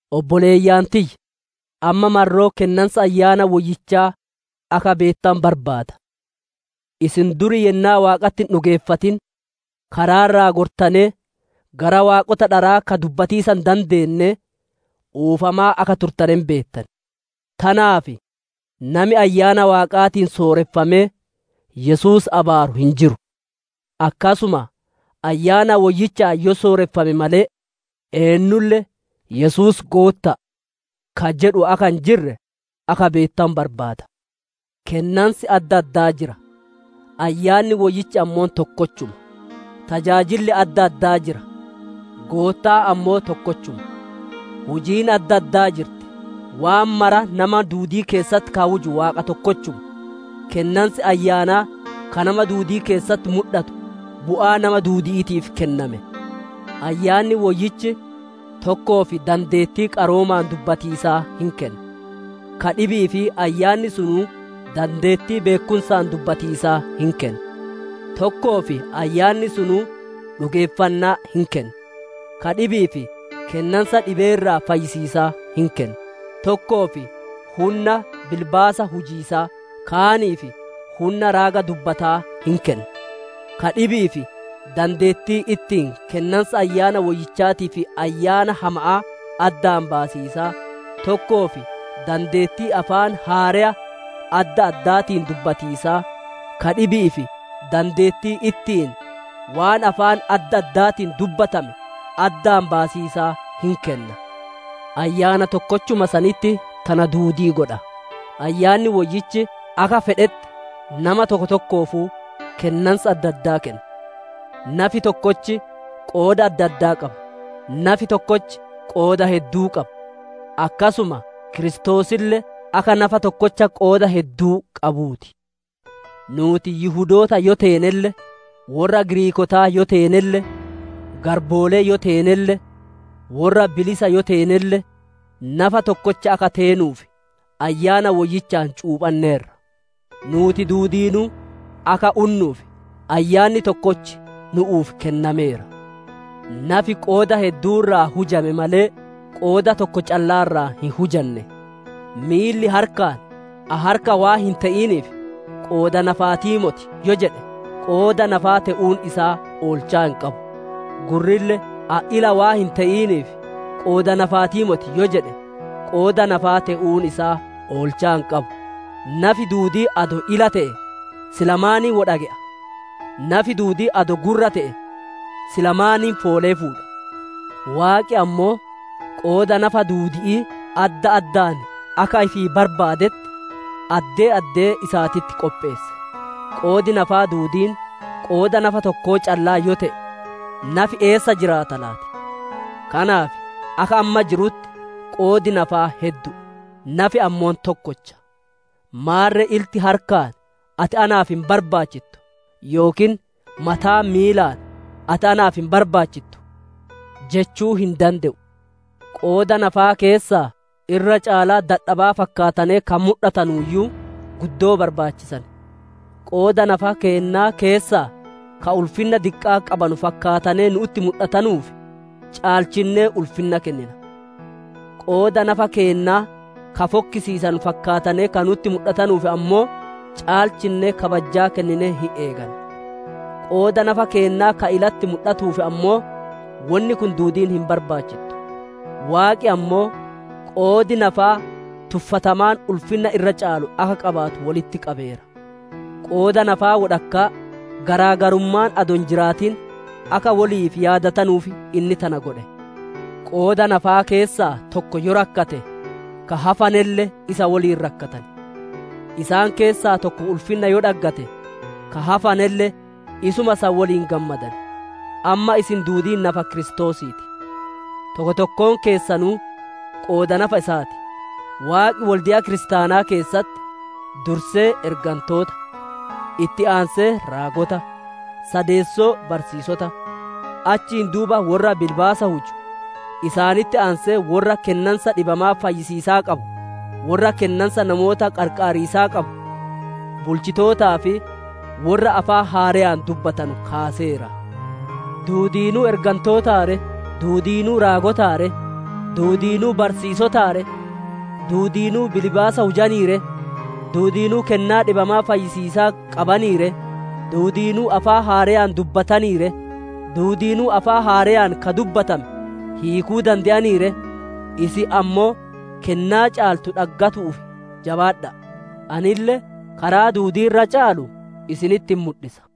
Obboleeyyan tiyya! Amma marroo kennansa Ayyaana Woyyichaa akka beettanu barbaada. Isin duri yennaa Waaqatti hin dhugeeffatin, karaa irraa gortanee gara waaqota dharaa ka dubbatiisa hin dandeennee, oofamaa akka turtane hin beettan. Tanaaf nami Ayyaana Waaqaatiin sooreffamee, Yesuus abaaru hin jiru; akkasuma Ayyaana Woyyichaan yoo sooreffame malee eennulle, «Yesuus Gootta'a» ka jedhu akka hin jirre akka beettanu barbaada. Kennansi adda addaa jira; Ayyaanni Woyyichi ammoo tokkochuma. Tajaajilli adda addaa jira; Goottaan ammoo tokkochuma. Hujiin adda addaa jirti; waan mara nama duudii keessatti ka huju Waaqa tokkochuma. Kennansi Ayyaanaa ka nama duudii keessatti mudhatu, bu'aa nama duudi'iitiif kenname. Ayyaanni Woyyichi tokkoof dandeettii qaroomaan dubbatiisaa hin kenna; ka dhibi'iif Ayyaanni sunuu dandeettii beekkumsaan dubbatiisaa hin kenna. Tokkoof Ayyaanni sunuu dhugeeffannaa hin kenna; ka dhibi'iif kennansa dhibee irraa fayyisiisaa hin kenna. Tokkoof hunna bilbaasa hujiisaa, kaaniif hunna raaga dubbataa hin kenna; ka dhibi'iif dandeettii ittiin kennansa Ayyaana Woyyichaatii fi ayyaana hama'aa addaan baasiisaa, tokkoof dandeettii afaan haareya adda addaatiin dubbatiisaa, ka dhibi'iif dandeettii ittiin waan afaan adda addaatiin dubbatame addaan baasiisaa hin kenna. Ayyaana tokkochuma sanitti tana duudii godha; Ayyaanni Woyyichi akka fedhetti nama tokko tokkoofuu kennansa addaa kenna. Nafi tokkochi qooda adda addaa qaba; nafi tokkochi qooda hedduu qaba. Akkasuma Kiristoosille akka nafa tokkocha qooda hedduu qabuu ti. Nuuti Yihudoota yoo teenelle, worra Giriikootaa yoo teenelle, garboolee yoo teenelle, worra bilisa yoo teenelle, nafa tokkocha akka teenuuf Ayyaana Woyyichaan cuuphanneerra; nuuti duudiinuu akka unnuuf Ayyaanni tokkochi nu'uuf kennameera. Nafi qooda hedduu irraa hujame malee, qooda tokko callaa irraa hin hujanne. Miilli harkaan, «Ani harka waan hin te'iniif, qooda nafaatii moti» yoo jedhe, qooda nafaa te'uun isaa oolchaa hin qabu. Gurrille, «Ani ila waan hin te'iniif, qooda nafaatii moti» yoo jedhe, qooda nafaa te'uun isaa oolchaa hin qabu. Nafi duudiin adoo ila te'e, sila maaniin woy dhage'a? Nafi duudiin adoo gurra te'e, sila maaniin foolee fuudha? Waaqi ammoo, qooda nafa duudi'ii adda addaan akka ifii barbaadetti, addee addee isaatitti qopheesse. Qoodi nafaa duudiin, qooda nafaa tokko callaa yoo te'e, nafi eessa jiraata laati? Kanaaf akka amma jirutti, qoodi nafaa heddu'u; nafi ammoo tokkocha. Maarre ilti harkaan, «Ati naaf hin barbaachittu» yookiin mataan miilaan, «Ati naaf hin barbaachittu» jechuu hin dande'u. Qooda nafaa keessaa irra caalaa dadhabaa fakkaatanee ka mudhatanuuyyuu, guddoo barbaachisan; qooda nafa keennaa keessaa ka ulfinna diqqaa qabanu fakkaatanee nu'utti mudhatanuuf, caalchinnee ulfinna kennina; qooda nafa keennaa ka fokkisiisanu fakkaatanee ka nu'utti mudhatanuuf ammoo, caalchinnee kabajjaa kenninee hin eeganna. Qooda nafa keennaa ka ilatti mudhattuuf ammoo, wonni kun duudiin hin barbaachittu. Waaqi ammoo, qoodi nafaa tuffatamaan ulfinna irra caalu akka qabaatu wolitti qabeera. Qooda nafaa wodhakkaa garaa garummaan adoo hin jiraatin, akka woliif yaadatanuuf inni tana godhe. Qooda nafaa keessaa tokko yoo rakkate, ka hafanelle isa woliin rakkatan; isaan keessaa tokko ulfinna yoo dhaggate, ka hafanelle isuma san woliin gammadan. Amma isin duudiin nafa Kiristoosii ti; tokko tokkoon keessanuu qooda nafa isaa ti. Waaqi wolde'a kiristaanaa keessatti dursee ergantoota, itti aansee raagota, sadeessoo barsiisota, achiin duuba worra bilbaasa huju, isaanitti aansee worra kennansa dhibamaa fayyisiisaa qabu, worra kennansa namoota qarqaariisaa qabu, bulchitootaa fi worra afaan haareyaan dubbatanu kaaseera. Duudiinuu ergantootaa ree? Duudiinuu raagotaa ree? Duudiinuu barsiisotaa ree? Duudiinuu bilbaasa hujanii ree? Duudiinuu kennaa dhibamaa fayyisiisaa qabanii ree? Duudiinuu afaan haareyaan dubbatanii ree? Duudiinuu afaan haareyaan ka dubbatame hiikuu dande'anii ree? Isin ammoo kennaa caaltu dhaggatiisaaf jabaadha'a. Anille karaa duudii irra caalu isinitti hin mudhisa.